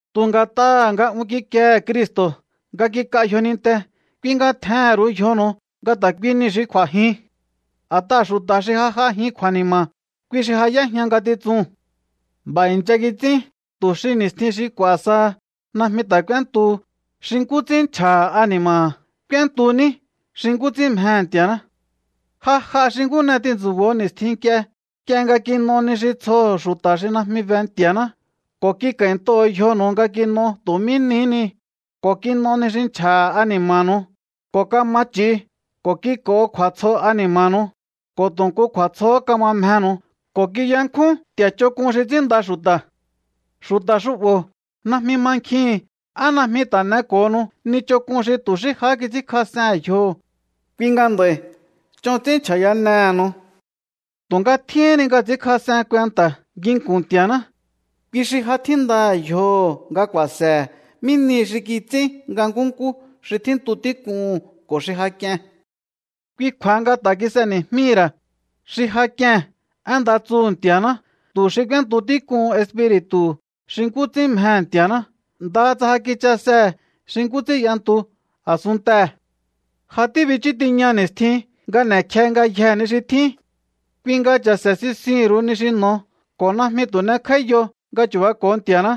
Tu̱ nga̱t'aha̱ nga un kikiehe̱ Cristo̱ nga kik'a yjoninnte, kui nga tjehe̱n ru̱u yjonu̱u nga ta̱ kui niu̱ xi kj'u̱a̱jin. A̱t'aha̱ xu̱ta̱ xi ja j'ajin kju̱a̱ni̱ma̱, kui xi ja y'éjña ngatitsuu̱n. B'a̱ i̱ncha kits'ín tu̱ xi ni̱stjin xi k'u̱a̱ saha najmi ta̱ k'úéntuhu xi nkú ts'ín nchja̱ha̱ ani̱ma̱ha̱. K'úéntu ní xi nkú ts'ín mjehe̱ Nti̱a̱ná. Ja j'a xi nkú n'e tintsu̱bo̱o ni̱stjin nk'ie, nk'ie nga kin'o ni xi tsjoho̱ xu̱ta̱ xi najmi be Nti̱a̱ná, ko̱ kik'a̱i̱ntoho̱o yjonu̱u nga kin'o tu̱ mí nihí ni, ko̱ kin'o ni xi nchja̱ha̱ ani̱ma̱nu̱u, ko̱ kama ch'i̱u, ko̱ kik'o̱ho̱o kju̱a̱tsjo ani̱ma̱nu̱u, ko̱ tu̱ nku kju̱a̱tsjohó kama mjenu̱u, ko̱ kiyankjún nti̱a̱ ch'onk'un xi ts'ínnda xu̱ta̱. Xu̱ta̱ xu'bo̱ najmi mankjihi̱n á najmi ta̱ n'eko̱honu ni ch'onk'un xi tu̱ ni xí jahá kits'ínkjas'ehe̱n yjoho̱. Kui nga nd'a̱i̱ ch'on ts'ín nchja̱yanehe̱nu̱u. Tu̱nga tjíhín ni nga ts'i̱ínkjas'en kuenta̱ nginku̱n Nti̱a̱ná. Kui xi ja tjíndaha̱ yjoho̱ nga ku̱a̱se̱he̱ mí nihi xi kits'ín nga nkúnkú xi tjíntu tík'uu̱n ko̱ xi ja k'ie̱n. Kui kju̱a̱ha nga ta̱ kis'eni̱jmíhi̱ ra̱ xi ja k'ie̱n én nda tsuhu̱ Nti̱a̱ná, tu̱ xi k'úéntu tík'uhun espi̱ri̱tu̱hu̱ xi nkú ts'ín mjehe̱ Nti̱a̱ná, ndaha tsa ja kichasehe̱ xi nkú ts'ín y'entu a̱sunntee̱. Ja tíbichú tiña ni̱stjin nga n'e̱kje ngayjee̱ ni xi tjín. Kui nga cha̱se̱ sinsihi̱n ru̱u ni xi n'o̱o ko̱ najmi tu̱ n'ekj'áíyo nga chu̱bako̱o Nti̱a̱ná.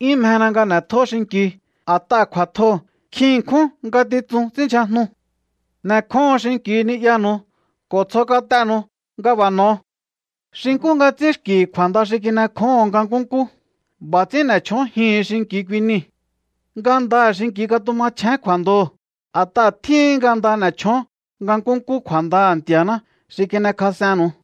'Yún mjena nga n'e̱tjó xinki̱u, a̱t'aha̱ kju̱a̱tjoo̱ nkjin ṉkjún ngatitsun ts'ínndyjajnu. N'e̱kjóho̱on xinki̱u ni'yanu̱u ko̱ tsjo kat'enu̱u nga b'a̱ n'o̱o. Xi nkú nga ts'ín xki̱ kju̱a̱nda xi kin'ekjóho̱on nga nkúnkú, b'a̱ ts'ín n'e̱ chjónjihi̱in xinki̱u kui niu̱. Ngandaha̱ xinki̱u̱ katumachjén kju̱a̱ndoo̱, a̱t'aha̱ tjíhin nga nda n'e̱ chjón nga nkúnkú kju̱a̱ndaha̱ Nti̱a̱ná xi kin'ekjas'ennu̱u.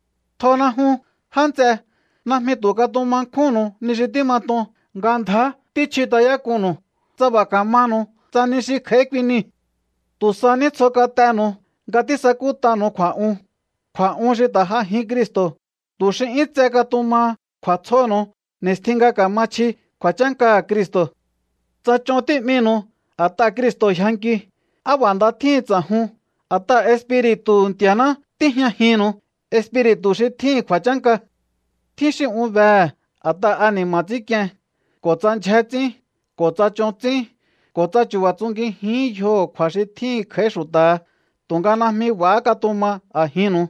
Tjona jun, já nts'e. Najmi tu̱ katuma nkjúnnu̱u ni xi tímat'on nga ndjá tíchjut'ayák'unnu̱u, tsa b'a̱ kamanu̱u tsa ni xi kj'a̱í kui nii̱. Tu̱ sa ní tsjo kat'enu̱u nga tísakút'anu̱u kju̱a̱'un, kju̱a̱'un xi ta̱ j'ajin Cristo̱, tu̱ xi 'yún tse katumaha kju̱a̱tsjonu̱u ni̱stjin nga ka̱ma chji kju̱a̱chánkaha̱ Cristo̱. Tsa ch'on tí'minu̱u a̱t'aha̱ Cristo̱ yjankiu, ¡á b'a̱ nda tjíhin ts'a̱jun! A̱t'aha̱ Espiri̱tu̱hu̱ Nti̱a̱ná tíjñajinnu̱u, Espiri̱tu̱ xi tjíhi̱n kju̱a̱chánka. Tjín xi un behe̱ a̱t'aha̱ ani̱ma̱ ts'ínk'ien, ko̱ tsa ndyjé ts'ín, ko̱ tsa ch'on ts'ín, ko̱ tsa chu̱ba̱ tsungijihín yjoho̱ kju̱a̱ xi tjíhi̱n kj'a̱í xu̱ta̱ha, tu̱nga najmi b'a̱há katuma a̱jinnuu.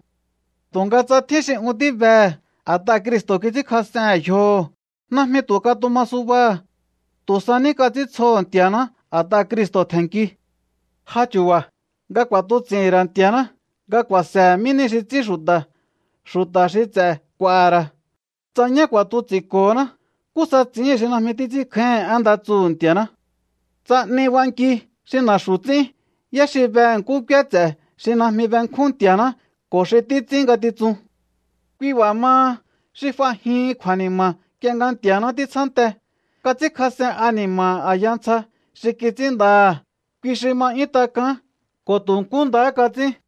Tu̱nga tsa tjín xi un tíbehe̱ a̱t'aha̱ Cristo̱ kits'ínkjas'ehe̱n yjoho̱, najmi tu̱ katuma subaha̱. Tu̱ sa ní kats'íntsjoho̱ Nti̱a̱ná a̱t'aha̱ Cristo̱ tje̱nki. Ja chu̱ba̱ nga ku̱a̱tuts'i̱hi̱n ra̱ Nti̱a̱ná nga ku̱a̱se̱he̱ mí nihi xi ts'ín xu̱ta̱. Xu̱ta̱ xi ts'e̱ k'u̱a̱ha̱ ra̱. Tsa ñá ku̱a̱tuts'i̱nko̱ho̱ná, ¿nkú sa ts'i̱íhi̱n xi najmi títs'ínkjáíhi̱n én nda tsuhu̱ Nti̱a̱ná? Tsa 'ni b'anki xi na̱xu̱ ts'ín, ¿yá xi behe̱ nkú k'úé ts'e̱ xi najmi benkjún Nti̱a̱ná ko̱ xi títs'ín ngatitsun? Kui b'a̱ maha, xi f'ajihin kju̱a̱ni̱ma̱ nk'ie nga Nti̱a̱ná títsjánte, kats'ínkjas'en ani̱ma̱ha̱ a̱ya ntsja xi kits'ínndaha̱, kui xi ma 'yún tak'aán, ko̱ tu̱ nkú ndahá kats'ín.